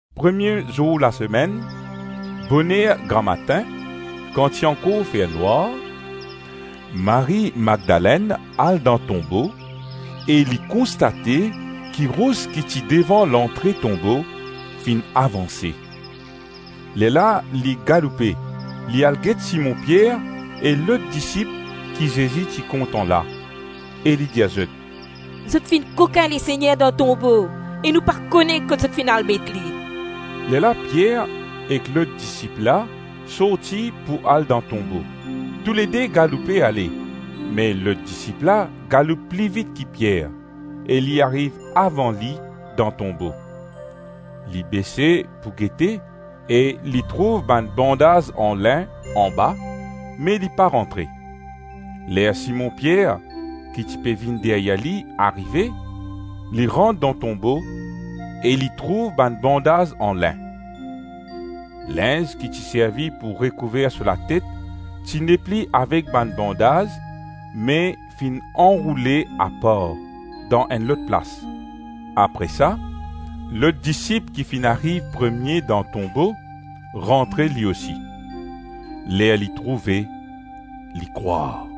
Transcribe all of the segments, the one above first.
Premie zour lasemenn, boner gramatin kan ti ankor fer nwar, Marie Madlenn al dan tonbo e li konstate ki ros ki ti devan lantre tonbo, finn avanse. Lerla li galoupe, li al get Simon Pier e lot disip ki Zezi ti kontan la e li dir zot, “Zot finn kokin Lesegner dan tonbo e nou pa kone kot zot finn al met li.” Lerla Pier ek lot disip la sorti pou al dan tonbo. Toulede galoupe ale me lot disip la galoup pli vit ki Pier e li ariv avan li dan tonbo. Li bese pou gete e li trouv bann bandaz an lin anba me li pa rantre. Ler Simon Pier, ki ti pe vinn deryer li, arive, li rant dan tonbo e li trouv bann bandaz an lin. Linz ki ti servi pou rekouver so latet, ti nepli avek bann bandaz me finn anroule apar dan enn lot plas. Apre sa, lot disip ki finn ariv premie dan tonbo, rantre li osi. Ler li trouve, li krwar.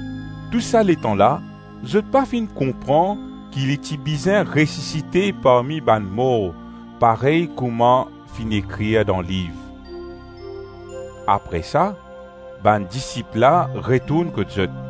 Tou sa letan la, zot pa finn konpran ki li ti bizin resisite parmi bann mor parey kouma finn ekrir dan liv. Apre sa, bann disip la retourn kot zot.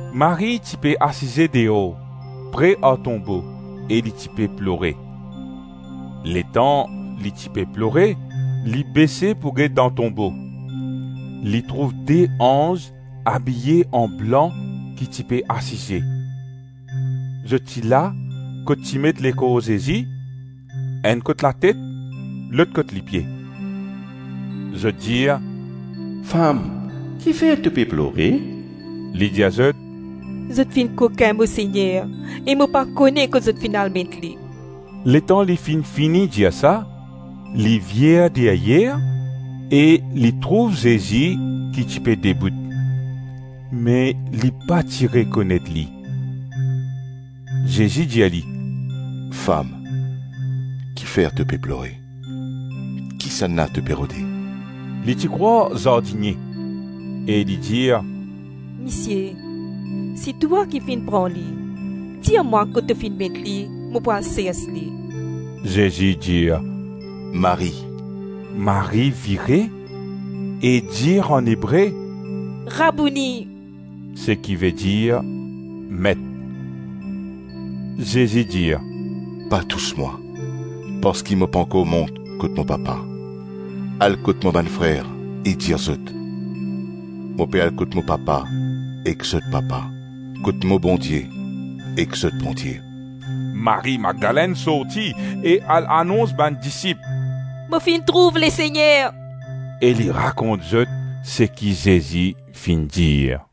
Marie ti pe asize deor, pre ar tonbo e li ti pe plore. Letan li ti pe plore, li bese pou get dan tonbo. Li trouv de anz abiye anblan ki ti pe asize; zot ti la, kot ti met lekor Zezi, enn kot latet, lot kot lipie. Zot dir, “Fam, ki fer to pe plore?” Li dir zot, “Zot finn kokin mo Segner e mo pa kone kot zot finn al met li.” Letan li finn fini dir sa, li vir deryer e li trouv Zezi ki ti pe debout, me li pa ti rekonet li. Zezi dir li, “Fam, ki fer to pe plore? Kisannla to pe rode?” Li ti krwar zardinie e li dir, “Misie, si twa ki finn pran li, dir mwa kot to finn met li, mo pou al sers li.” Zezi dir, “Marie.” Marie vire e dir an Ebre, “Rabouni!” (Seki vedir Met). Zezi dir, “Pa tous mwa, parski mo pankor mont kot mo Papa. Al kot mo bann frer e dir zot, ‘Mo pe al kot mo Papa ek zot Papa, kot mo Bondie ek zot Bondie.’” Marie Madlenn sorti e al anons bann disip, “Mo finn trouv Lesegner!” E li rakont zot seki Zezi finn dir.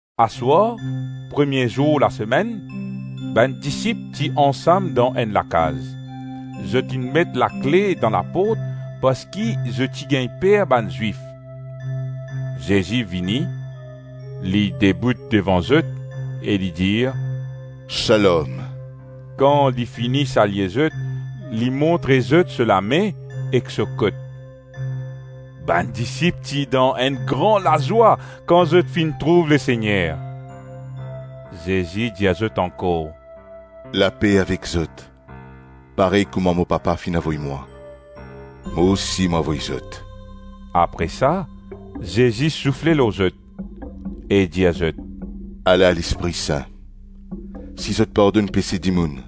Aswar premie zour lasemenn, bann disip ti ansam dan enn lakaz. Zot inn met lakle dan laport parski zot ti gagn per bann Zwif. Zezi vini, li debout devan zot e li dir, “Shalom”. Kan li fini salye zot, li montre zot so lame ek so kot. Bann disip ti dan enn gran lazwa kan zot finn trouv Lesegner. Zezi dir zot ankor, “Lape avek zot; parey kouma mo Papa finn avoy mwa, mo osi mo avoy zot.” Apre sa, Zezi soufle lor zot e dir zot, “Ala Lespri Sin. Si zot pardonn pese dimoun,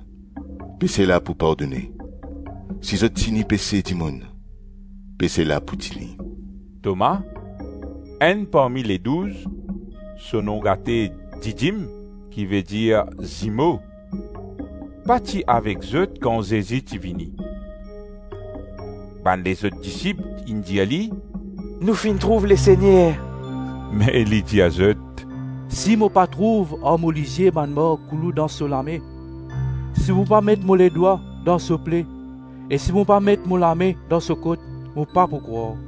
pese la pou pardone, si zot tini pese dimoun, pese la pou tini.” Toma, enn parmi Ledouz, (so nom gate Didim, ki vedir Zimo), pa ti avek zot kan Zezi ti vini. Bann lezot disip inn dir li, “Nou finn trouv Lesegner.” Me li dir zot, “Si mo pa trouv ar mo lizie bann mark koulou dan so lame, si mo pa met mo ledwa dan so ple e si mo pa met mo lame dan so kot, mo pa pou krwar.”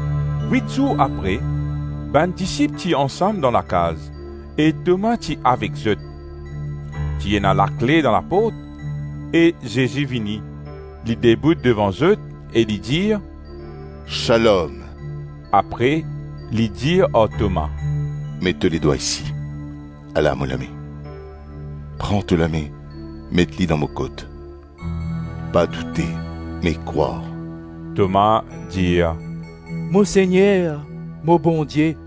Wit zour apre, bann disip ti ansam dan lakaz e Toma ti avek zot. Ti ena lakle dan laport e Zezi vini, li debout devan zot e li dir, “Shalom.” Apre li dir ar Toma, “Met to le dwa isi, ala mo lame; pran to lame, met li dan mo kot. Pa doute me krwar.” Toma dir, “Mo Segner, mo Bondie.”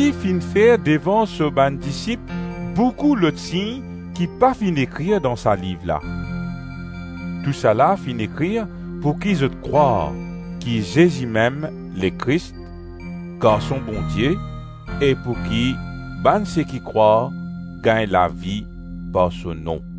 Zezi finn fer devan so bann disip boukou lot sign ki pa finn ekrir dan sa liv la. Tousala finn ekrir pouki zot krwar ki Zezi-mem Lekris, Garson Bondie e pouki bann seki krwar gagn lavi par so nom.